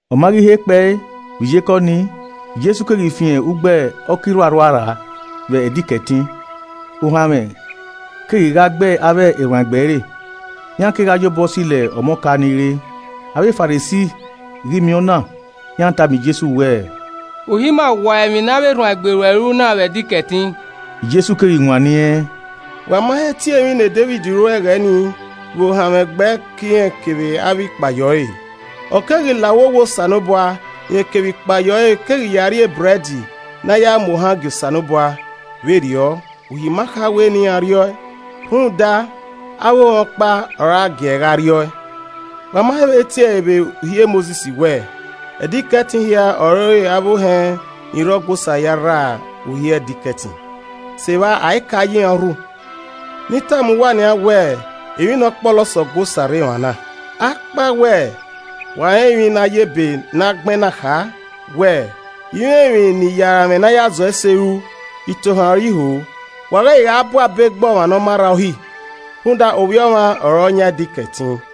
Ọ ma ghi he kpee vbe iyeke ọnii, Jesu keghi fian ugbo ọka irhuarhua rra vbe Ẹdẹ Ikẹtin. Ohanmwẹ keghi gha gbe avbe erhuanegbe ẹre, iran kegha yobọ silo ọmọ ọka ni re. Avbe Farisi ghi miẹn ọna, iran tama Jesu wẹẹ, “Uhi ima wua emwi ne avbe erhuanegbe ruẹ ru na vbe Ẹdẹ Ikẹtin!” Jesu keghi wanniẹn, “Wa ma he tie emwi ne Devid ru ẹghẹ ni vbe ohanmwẹ gbẹe ke irẹn kevbe avbe ikpayẹ ọre? Ọ keghi la uwu owa Osanobua, rẹn kevbe ikpayẹ ọre keghi ya rri ebrẹd ne a ya mu ohan gie Osanobua, vberriọ, Uhi ma kha wẹ ne iran rriọe, rhunmwuda, avbe ohẹn ọkpa ọre a giee gha rriọe. Wa ma he vbe tiẹ ẹre vbe Uhi e Mosis wẹẹ, Ẹdẹ Ikẹtin hia ọre avbe ohẹn ni rre Ọgua Osa ya rra uhi Ẹdẹ Ikẹtin, sevba ai kae ya iran urhu? Ne I tama uwa nian wẹ emwi ne ọ kpọlọ sẹ Ọgua Osa rre emwa na. Akpawẹ wa rẹn emwi ne a ya ebe na gbẹn na kha wẹẹ, ‘I i mwẹ emwi ne I ya aranmwẹ ne a ya zọ ese ruẹ itohan ọre I ho’ wa ghẹ i gha bu abe gbe ọmwa ne ọ ma rra uhi. Rhunmwuda Ovbi Ọmwa ọre ọ yan Ẹdẹ Ikẹtin.”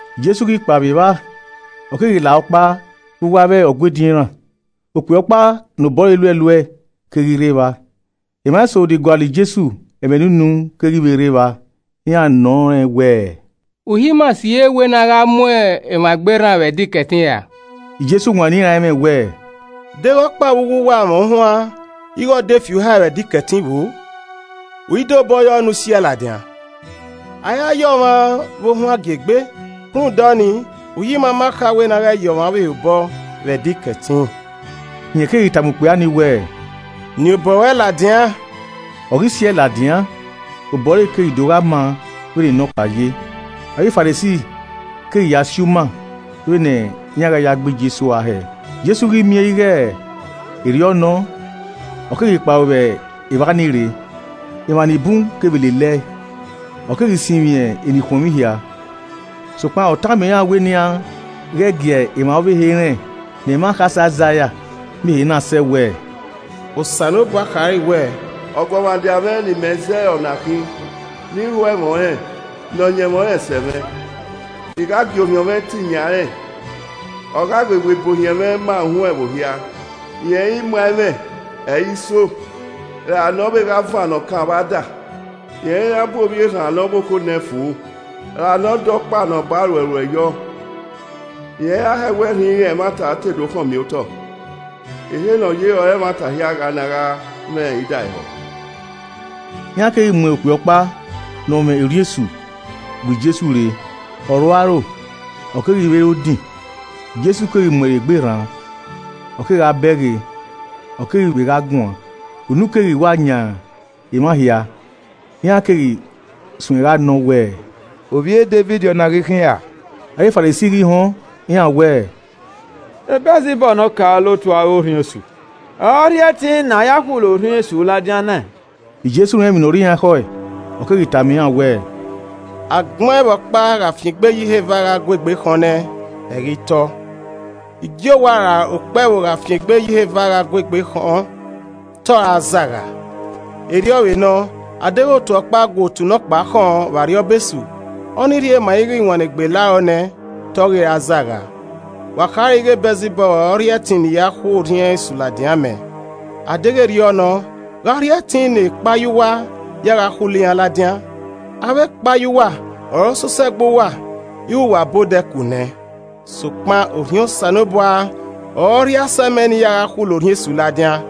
Jesu ghi kpa vbe evba, ọ keghi la ọkpa vbe uwu avbe Ọgua ediọn iran. Okpia ọkpa ne obọ ẹre luẹluẹe keghi rre evba. Emwa eso ni gualọ Jesu ẹmwẹ ne unu keghi vbe rre evba. Iran nọ rẹn wẹẹ, “Uhi ma sighe wẹ ne a ghẹ mu ọmwa egbe rran vbe Ẹdẹ Ikẹtin ra?” Jesu wanniẹn iran ẹmwẹ wẹẹ, “Deghẹ ọkpa vbe uwu uwa mwẹ ohuan ighe ọ de fi uhae vbe Ẹdẹ Ikẹtin vbo? U i de obọ yọ ne u siẹe ladian? A i ra ya ọmwa vbe ohuan gie egbe. Rhunmwuda ọnii, Uhi ima ma kha wẹ ne a ghẹ ya ọmwa ọvbehe obọ vbe Ẹdẹ Ikẹtin.” Rẹn keghi tama okpia ni wẹẹ, “Niẹn obọ ruẹ ladian.” Ọ ghi siẹe ladian, obọ ẹre keghi do gha maa vbene nọkpa ye. Avbe Farisi keghi ya si uma vbene iran gha ya gbe Jesu ua hẹẹ. Jesu ghi miẹn ighe erriọ nọ, ọ keghi kpao vbe evba ni rre, emwa ni bun kevbe lelẹe. Ọ keghi sinmwi enikhuọnmwi hia. Sokpan ọ tama iran wẹ ne iran ghẹ gie emwa ọvbehe rẹn, ne ẹmwẹ akhasẹ Aizaia miẹn ehe na sẹ wẹẹ: “Osanobua khare wẹẹ, ọguọmwadia mwẹ ne I mẹ zẹẹ ọre ọna khin. Ne I ho ẹmwẹ ọnrẹn, ne ọyẹnmwẹ ọnrẹn sẹ mwẹ. I gha gie Orhiọn mwẹ tin yan rẹn, ọ gha wewe ibuohiẹn mwẹ ma uhunmwu ẹvbo hia, rẹn i muan ẹmwẹ, ẹ i soo, ra ne ovbe gha vannọ okan vbe ada. Rẹn i ra bun ovbi erhan ne ọ vbokho nẹ fo, ra ne ọ dọ ukpa ne ọ ba ruẹ ruẹ yọ. Rẹn i ra hẹwẹ rhinrin ẹmwata te do khọnmiotọ, ehe ne ọ ye ọre emwa hia gha na gha mwẹ idaehọ.” Iran keghi mu okpia ọkpa ne ọ mwẹ orhiọn esu bu Jesu rre, ọ rhu aro ọ keghi vbe re odin. Jesu keghi mu ẹre egbe rran, ọ kegha bẹghe, ọ keghi vbe gha guan. Unu keghi wa yan emwa hia. Iran keghi suẹn gha nọ wẹẹ, “Ovbi e Devid ọna ghi khin ra?” Avbe Farisi ghi họn, iran wẹẹ, “E Bẹlzibọb ne ọkaolotu avbe orhiọn esu, ọre ọ rhie ẹtin ne ọ ya khulo orhiọn esu ladian nẹẹn.” Jesu rẹn emwi ne ọ rre iran ekhọe, ọ keghi tama iran wẹẹ, “Agbọn ẹvbo ọkpa gha fian egbe ye iheva gha gu egbe khọn nẹ, ẹ i ghi tọ. Igiowa ra okpẹvbo gha fian egbe ye iheva gha gu egbe khọn, te ọ zagha. Erriọ vbe nọ, a deghẹ otu ọkpa gu otu nọkpa khọn vbe arriọba Esu, ọ ni rhie ma ighe iwannegbe la rọ nẹ, te ọ ghi ra zagha. Wa khare ighe Bẹlzibọb ọre ọ rhie ẹtin ne I ya khu orhiọn esu ladian mẹ. A deghẹ erriọ nọ, gha ọ rhie ẹtin ne ekpayẹ uwa ya gha khulo iran ladian. Avbe ekpayẹ uwa ọre ọ sosẹe gbe uwa ighe uwa ba odẹ ku nẹ. Sokpan Orhiọn Osanobua ọre ọ rhie asẹ mẹ ne I ya gha khulo orhiọn esu ladian,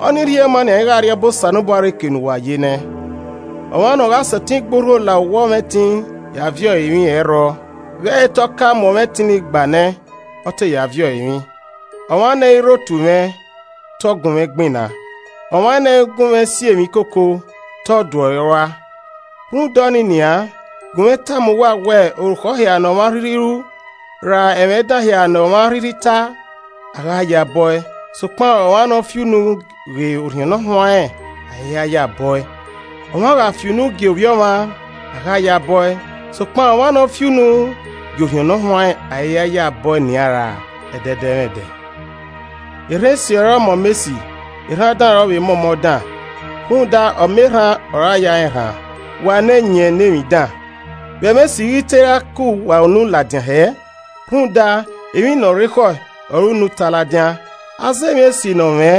ọ ni rhie ma nian ighe Arriọba Osanobua rre ke uwa yi nẹ. “Ọmwa ne ọ gha sẹtin gbe urho la owa ọmwẹtin ya viọ ẹre emwi, ẹ i rrọọ vbe ẹ i rre te ọ ka mu ọmwẹtin ni gba nẹ, ọ te ya viọ ẹre emwi. “Ọmwa ne ẹ i rre otu mwẹ, te ọ gunmwẹ gbinna. Ọmwa ne ẹ i gunmwẹ si emwi koko, te ọ duẹ ọre rua a. Rhunmwuda ọnii nian, gunmwẹ tama uwa wẹ orukhọ hia ne ọmwa rhirhi ru, ra ẹmwẹ dan hia ne ọmwa a rhirhi ta, a gha ya bọ e, sokpan ọmwa ne ọ fi unu ghe Orhiọn Ne Ọ Huanrẹn a i ya bọe. Ọmwa gha fi. unu gie ovbi ọmwa, a gha ya bọe, sokpan ọmwa ne ọ fi unu gie Orhiọn Ne Ọ Huanrẹn, a i ya bọe nian ra ẹdẹdẹmwẹdẹ. “Erhan esi ọre ọ mọ ọmọ esi. Erhan dan ọre ọ vbe mọ ọmọ dan, rhunmwuda ọmọ erhan ọre a ya rẹn erhan. Wa ne ẹyẹn ne emwi dan, vbe ẹmwẹ esi ighi te ra ke uwa unu ladian hẹẹ? rhunmwuda, emwi ne ọ rre ekhọe ọre unu na ta ladian. Aza emwi esi ne ọ mwẹ,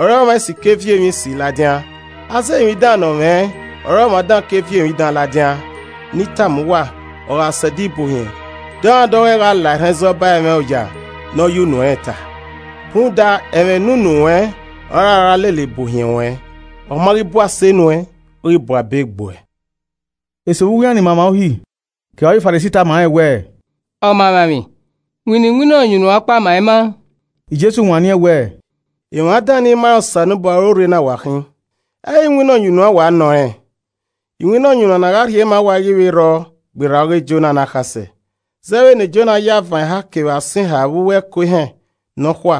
ọre ọmwa esi ke viọ emwi esi ladian. Aza emwi dan ne ọ mwẹ, ọre ọmwa dan ke viọ emwi dan ladian. “Ne I tama uwa, ọ gha sẹ ẹdẹ ibuohiẹn, dọmwadẹ ọghọe gha la erhan ẹzọ ba ẹmwẹ oya ne ọ ya unu ẹnrẹn ta. Rhunmwuda, ẹmwẹ ne unu ruẹn ọre a ra lele bu ohiẹn ruẹn. Ọ ma ghi bu ase nuẹn, ọ ghi bu abe gbuẹ.” Eso vbe uwu iran ni ma emwa Uhi kevbe avbe Farisi tama rẹn wẹẹ, “Ọmaemwaemwi, winna iwinna ọyunnuan ọkpa ma ima.” Jesu wanniẹn wẹẹ, “Emwa dan ni ma rẹn Osanobua ọre orre na wa khin! Ẹ i re iwinna ọyunnuan wa nọ rẹn? Iwinna ọyunnuan ne a gha rhie ma uwa i ghi vbe rrọọ gberra ọghe Jona ne akhasẹ. Zẹ vbene Jona ya avan eha kevbe asọn eha vbe uwu ẹko ehẹn nọkhua,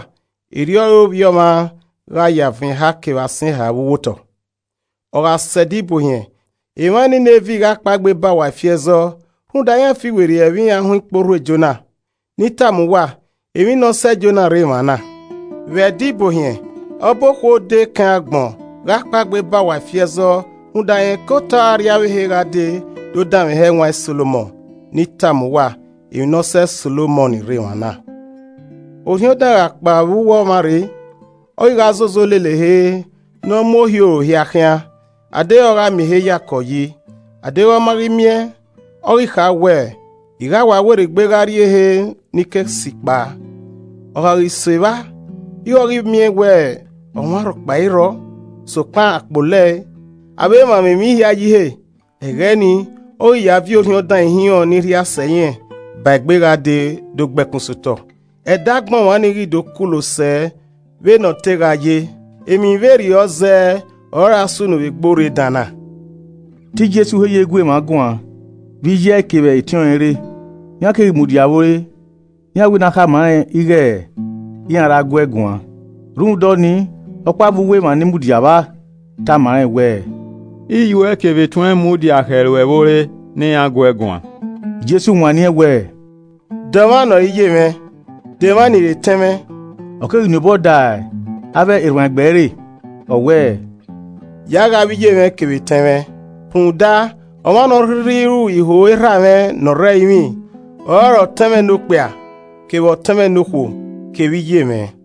erriọ ọre Ovbi Ọmwa gha ya avan eha kevbe asọn eha vbe uwu otọ. Ọ gha sẹ Ẹdẹ Ibuohiẹn, emwa Ninevi gha kpaegbe ba uwa ifi ẹzọ rhunmwuda iran fiwerriẹ vbe iran họn ikporhu e Jona. Ne I tama uwa, emwi ne ọ sẹ Jona rre emwa na. Vbe Ẹdẹ Ibuohiẹn, ọba okhuo odẹ Ekẹn agbọn gha kpaegbe ba uwa ifi ẹzọ rhunmwuda rẹn ke otọe arriavbehe gha dee do danmwehọ ẹwaẹn Solomọn. Ne I tama uwa, emwi ne ọ sẹ Solomọn rre emwa na. “Orhiọn dan gha kpao vbe uwu ọmwa rre, ọ ghi gha zozo lele ehe ne ọ mu ohioro hia khian adeghẹ ọ gha miẹn ehe yakọ yi, adeghẹ ọ ma ghi miẹn, ọ ghi kha wẹ, ‘I gha wa werriegbe gha rrie ehe ne I ke si kpao.’ Ọ gha ghi sẹ evba, ighe ọ ghi miẹn wẹ ọmwa rhọkpa i rrọọ, sokpan a kpolo ẹe, a vbe mwamwa emwi hia yi ihe. Ẹghẹ ni, ọ ghi ya viọ orhiọn dan ihinrọn. ni rhia sẹ irẹn ba egbe gha dee do gbe ẹkun sotọ. Ẹdẹ agbọn ọmwa ni ghi do kulo sẹ vbene ọ te gha ye. Emwi vberriọ zẹẹ ọre ọra sunu vbe egbe orre dan na.” Te Jesu he ye gu emwa guan vbe iye ẹe kevbe etiọnrẹn rre, iran keghi mudia vbe ore, iran wẹ ne a khama rẹn ighe iran ra guee guan. Rhunmwuda ọnii, ọkpa vbe uwu emwa ni mudia vba, tama rẹn wẹẹ, “Iyuẹ kevbe etuẹn mudia khẹ ruẹ vbe ore ne iran guẹ guan.” Jesu wanniẹn wẹẹ, “De ọmwa ne ọ re iyemwẹ? De emwa ni re etẹn mwẹ?” Ọ keghi nien obọ da avbe erhuanegbe ẹre ọ wẹẹ, “Ya ghe avbe iyemwẹ kevbe etẹn mwẹ. Rhunmwuda ọmwa ne ọ rhirhi ru iho Erhamwẹ ne ọ rre ẹrinmwi ọrọre ọtẹn mwẹ nokpia, kevbe ọtẹn mwẹ nokhuo kevbe iye mwẹ.”